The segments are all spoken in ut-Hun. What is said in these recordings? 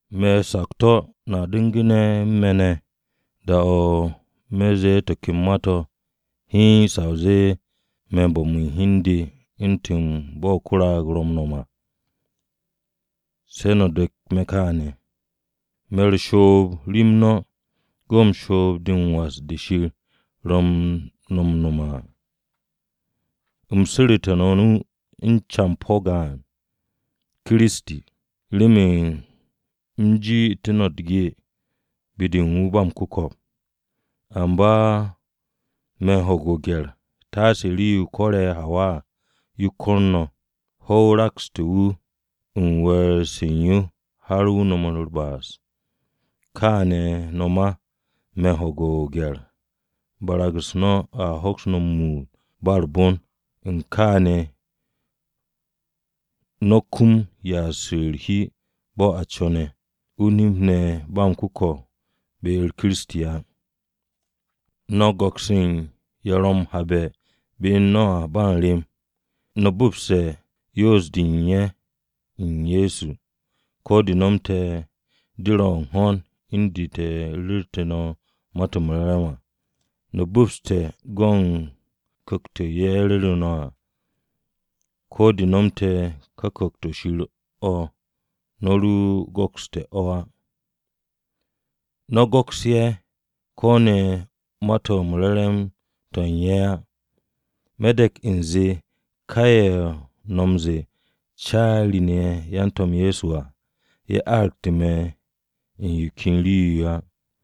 Me̱ o-sakto̱ no̱a du̱ngu̱ne̱ u̱n me̱ ne̱ da-o̱ me̱ ze̱e̱ to̱ ken ma-to̱ hiin sa o zee me̱n bo̱m u̱n hi u̱n de u̱ntu̱n bo̱ ko-raag ro̱ m-nom à. Se̱ no̱ dek me̱ kaane̱! Me̱ u̱r-shoob rem no̱, go̱n shoob-de m-was de Shir ro̱ no̱ m-nome̱ à. U̱m su̱ru̱tu̱ no̱ o-nu u̱n campo̱ gaan, Kiristi, remen u̱m ji'itté̱ no̱ u̱t-ge be-de u̱n wu̱ ba m-ku̱ko̱p. Amba me̱ u̱n ho̱ge̱ o-gye̱r taase rii-yo ko̱re̱ Hawa à, yo ko̱r no̱. Hwo̱-o rakste̱ wu̱ u̱n we̱e̱r-se u̱n yo har wu̱ nomu̱ u̱r-ba'as. Kaane̱ no̱ ma, me̱ u̱n ho̱ge̱ o-gye̱r barag-u̱s no̱ a hoks no̱ m-muut ba u̱r-bon, u̱n kaane̱, no̱a kum ya'as u̱r-hi bo̱ a co̱ne̱, o-nip ne̱ ba m-ku̱ko̱p be-u̱r Kiristi á. No̱ m-go̱ks u̱n ye̱ ro̱ m-habe̱ be u̱n no̱ à ba m-rem. No̱ bu̱pse̱ yoos-de u̱n ye̱ u̱n Ye̱so, ko̱ de nomte̱ de ro̱ u̱n ho̱n u̱n de te̱ ru̱rte̱ Ma-to̱ m-Re̱re̱m à. No̱ bu̱pse̱ go̱ u̱n ku̱kt-o̱ ye̱ ru̱ru̱ no̱ à, ko̱ de nomte̱ ka Ku̱kt-o̱ Shir o̱ no̱ ro go̱kste̱ o̱ á. No̱ go̱ks ye̱ ko̱ ne̱ ma-to̱ re̱re̱m-to̱ u̱n ye̱ á. Me̱ de̱k u̱nze ka ye̱ no̱ m-ze̱e̱, “Caari-ne̱ ye̱ u̱n yan-To̱m Ye̱so” à, ye̱ aragte̱ me̱ u̱n yo ken rii-yo á.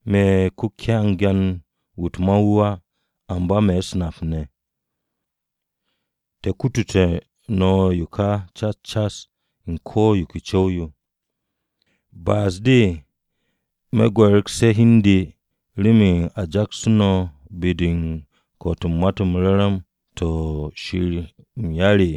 Me̱ ko-kyangan-wu̱ u̱t-ma wu̱ á, amba me̱ u̱s-nap ne̱. Te̱ kutute̱ no̱ yo ka cas cas u̱n ko̱ yo ke co̱w-yo. ¿Ba'as-de me̱ gwe̱re̱gse̱ hi u̱n de remen a jaksté̱ no̱ be-de u̱n ko̱'o̱t u̱n Ma-to̱ m-Re̱re̱m to̱ Shir m-yar?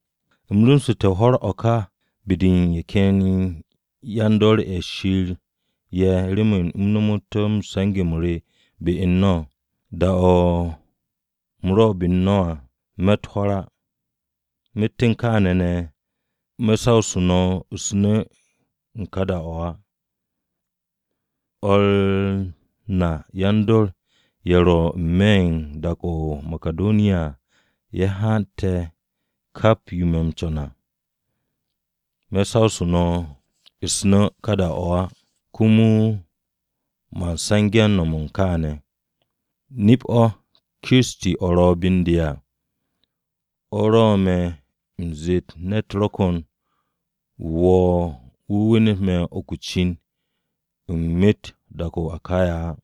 U̱m rumsu̱nte̱ hwo̱r o̱ ka be-de u̱n ye̱ ken yan-dor ye̱ Shir ye̱ remen u̱m nomot se̱nge̱-m re be u̱n no̱. Da-o u̱m ro be u̱n no̱ à, me̱tt hwo̱r á. Myet u̱n kaane̱ ne̱ me̱ sawsu̱ no̱ u̱s-nu̱ ka da-o̱ á. O̱r na yan-dor ye̱ ro̱ n-me̱ u̱n dak-o̱ o-Makidoniya à ye̱ hante̱ kap yo me̱ m-co̱n à. Me̱ sawsu̱ no̱ u̱s-nu̱ ka da-o̱ á, komo man se̱nge̱-m nom u̱n kaane̱. Nip-o Kiristi o̱ ro̱ be u̱n de à, o̱ rwo̱'u̱ me̱ m-zet ne̱t ro̱ ko̱n wu̱ wo̱o̱ wu̱ wenet me̱ uku o-cin u̱n myet dak-o̱ o-Akaya á.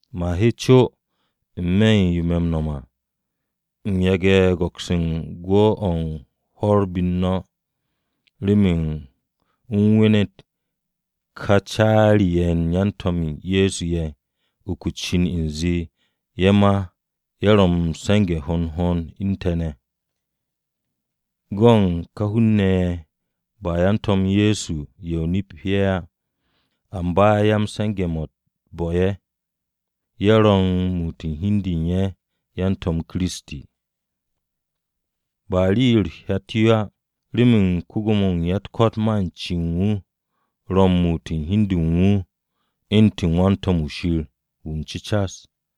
Man he co n-me̱ u̱n yo me̱ m-no̱m à, u̱n yage̱ u̱n go̱ks u̱n gwu̱-o̱ u̱n hwo̱r be-u̱r no̱, remen u̱m wenet ká “Caari-ye̱ u̱n yan-To̱m Ye̱so ye̱” uku o-cin u̱nze, ye̱ ma ye̱ ro̱ m-se̱nge̱ hond hond u̱n te̱ ne̱. Go̱ u̱n ka hun-ne̱ ye̱ ba yan-To̱m Ye̱so ye̱ o-nip ye̱ á, amba yan-se̱nge̱-mo̱ u̱t-bo̱ ye̱. Ye̱ ro̱ u̱n muut u̱n hi u̱n de u̱n ye̱ yan-To̱m Kiristi. Ba rii-yo u̱t-hyat yo̱ á, remen ko-Gwo̱mo-wu̱ u̱n ya-u̱t-ko̱t ma u̱n cen wu̱ ro̱ m-muut u̱n hi u̱n de u̱n wu̱ u̱ntu̱n wan-to̱m-wu̱ Shir wu̱ m-cu̱cas.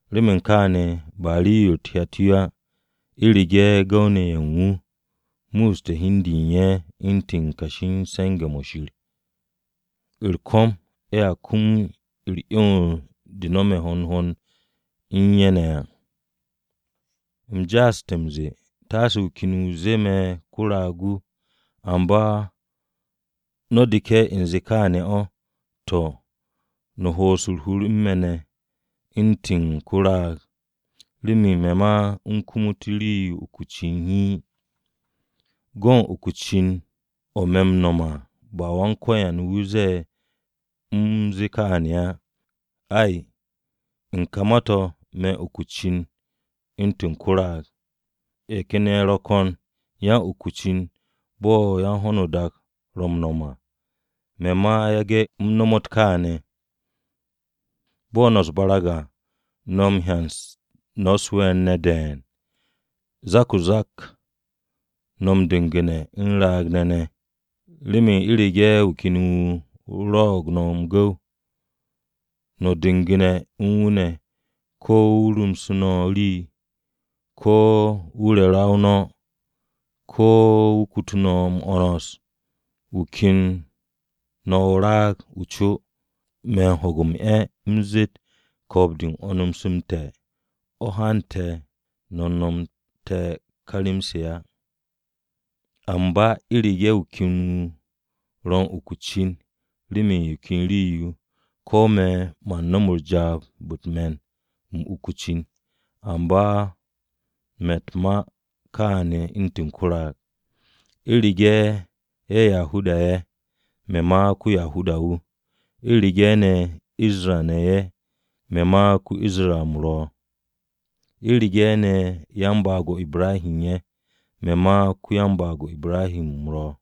Remen kaane̱ ba rii-yo u̱t-hyat yo á u̱rege̱ gu̱w-ne̱ ye̱ u̱n wu̱ ye̱ musste̱ hi u̱n de u̱n ye̱ u̱ntu̱n yan-kashi m-se̱nge̱ mo̱ Shir. U̱r-ko̱m ye̱a kum u̱r-'yons de no̱me̱ hond hond u̱n ye̱ ne̱ à. U̱m ja'aste̱ m-ze̱e̱, taase wu̱ ken wu̱ zee me̱ ko-raag-wu̱. Amba no̱ deke̱ u̱nze kaane̱ o̱, to̱, no̱ ho'os u̱r-hur u̱n me̱ ne̱ u̱ntu̱n ko-raag, remen me̱ ma u̱m kumut rii-yo uku o-cin hiin. Go̱ u̱n ka uku cin-o̱ me̱ m-no̱m à, ba Wan-Ko̱yan wu̱ ze̱e̱ u̱m zee kaane̱ á. Ay, u̱n ka ma-to̱, me̱n uk o-cin u̱ntu̱n ko-raag. Ye̱ ken ye̱ ro̱ ko̱n yan-uku-cin bo̱ yan-ho̱no-o-dak ro̱ m-no̱m à, me̱ ma yage̱ u̱m nomot kaane̱. Bo̱ no̱ u̱s-barag à, no̱ m-hyan no̱ u̱s-we̱e̱r ne̱ de̱e̱n, zak-o-zak no̱ m-du̱gu̱ne̱ u̱n raag-ne̱ ne̱! Remen u̱rege̱ wu̱ ken wu̱ rwo̱'o̱g no̱ m-gu̱w, no̱ m-du̱ngu̱ne̱ u̱n wu̱ ne̱, ko̱ wu̱ rumse̱ no̱ rii, ko̱ wu̱ re ra-o no̱, ko̱ wu̱ kutu no̱ m-'wo̱ns, wu̱ ken no̱ o-raag. Me̱ m-ho̱ge̱ m-'e̱ u̱m zet ko̱o̱b-de u̱n 'wo̱ns-m te̱ o̱ hante̱ te̱ nomte̱ ka rem-se á! Amba u̱rege̱ wu̱ ken wu̱ ro̱ u̱n uku o-cin, remen yo ken rii-yo, ko̱ me̱ man nom jaab-o̱ u̱t-me̱n u̱m uku o-cin, amba me̱ u̱t-ma kaane̱ u̱ntu̱n ko-raag. U̱rege̱ ye̱ Yahuda-ne̱ ye̱, me̱ ma ko-Yahuda-wu̱. U̱rege̱ ne̱ Isra-ne̱ ye̱, me̱ ma ko-Isra u̱m ro̱. U̱rege̱ ne̱ yan-baag-o Ibrahi ye̱, me̱ ma ko-yan-baag-o Ibrahi u̱m ro̱.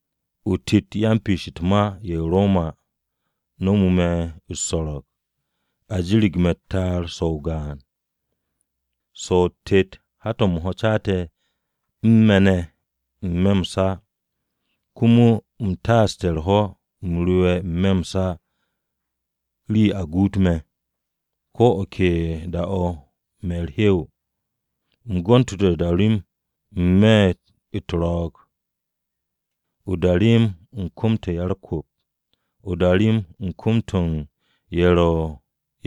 O-tet yan-piish u̱t-ma ye̱ u̱n Roma-ne̱ nomu̱ me̱ u̱s-so̱ro̱g. A jirig me̱ u̱t-ta'ar so̱ o-gaan. So̱ o-tet hat-to̱ m-ho̱ caate̱ u̱n me̱ ne̱ n-me̱ m-sa. Komo u̱m taaste̱ u̱r-ho̱ u̱m rewe̱ n-me̱ m-sa rii-yo a guut me̱. Ko̱ o̱ ke da-o̱ me̱ u̱r-hew. U̱m gontu̱te̱ o-darem n-me̱ u̱t-ro̱o̱g, o-darem u̱n kom-to̱ u̱n ya-u̱r-kwu̱p. O-darem u̱n kom-to̱ u̱n ye̱ ro̱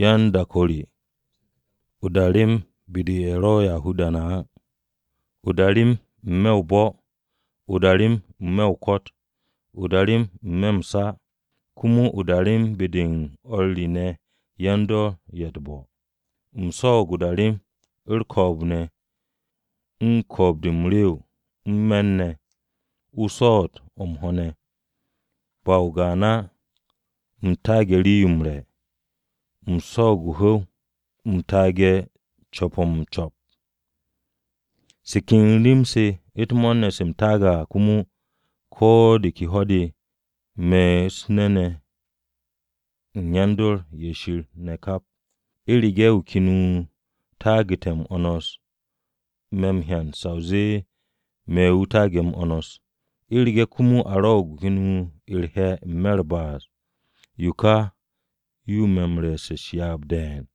yan-dak-o re à, o-darem be-de u̱n ye̱ ro̱ Yahuda-ne̱ á, o-darem n-me̱ o-bo̱, o-darem n-me̱ o-ko̱t, o-darem n-me̱ m-sa, komo o-darem be-de u̱n o̱r re ne̱ yan-dor ye̱ u̱t-bo̱. U̱m swo̱o̱g o-darem, u̱r-ko̱o̱b ne̱, u̱n ko̱o̱b-de m-rew, u̱n me̱r ne̱, o-swo̱o̱t o̱ m-ho̱ ne̱. Ba o-gaan á u̱m taage̱ rii-yo m-re̱, u̱m swo̱o̱g o-hu̱w, u̱m taage̱ u̱n co̱p-o̱ m-co̱p. Se ken rem-se u̱t-mo̱o̱r ne̱ se u̱m taage̱ à komo, ko̱ de ke ho̱-de me̱ u̱n nu̱-se u̱n yan-dor ye̱ Shir ne̱ kap. U̱rege̱ wu̱ ken wu̱ taagu̱te̱ m-'wo̱ns me̱ m-hyan sa o zee me̱ wu̱ taage̱ m-'wo̱ns. U̱rege̱ komo a rwo̱'o̱g wu̱ ken wu̱ u̱r-he̱ n-me̱ u̱r-ba'as, yo ka yo ro̱ me̱ re̱e̱s u̱s-ryaab de̱e̱n.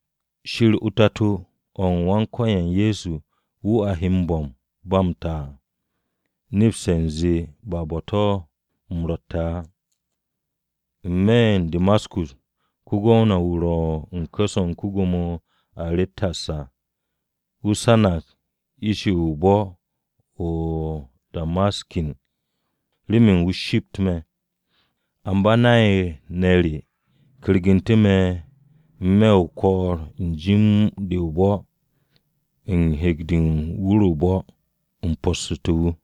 Shir o-Tato o̱ u̱n Wan-Ko̱yan Ye̱so, wu̱ a he m-bo̱m ba m-ta à, nepse̱ u̱nze ba bo̱-to̱ u̱m ro̱tte̱ á. N-me̱ o-Damaskus, ko-gwamna-wu̱ ro̱ u̱n ku̱s-o̱ u̱n ko-Gwo̱mo Aretas à wu̱ sanag ish-ye̱ u̱n bo̱-o̱ o-Damaskus remen wu̱ shipt me̱. Amba nay-ne̱ re kyergu̱ntu̱ me̱ n-me̱ o-ko̱o̱r u̱n jim-de o-bo̱ u̱n hek-de u̱n wur-o̱ o-bo̱, u̱m possu̱té̱ wu̱.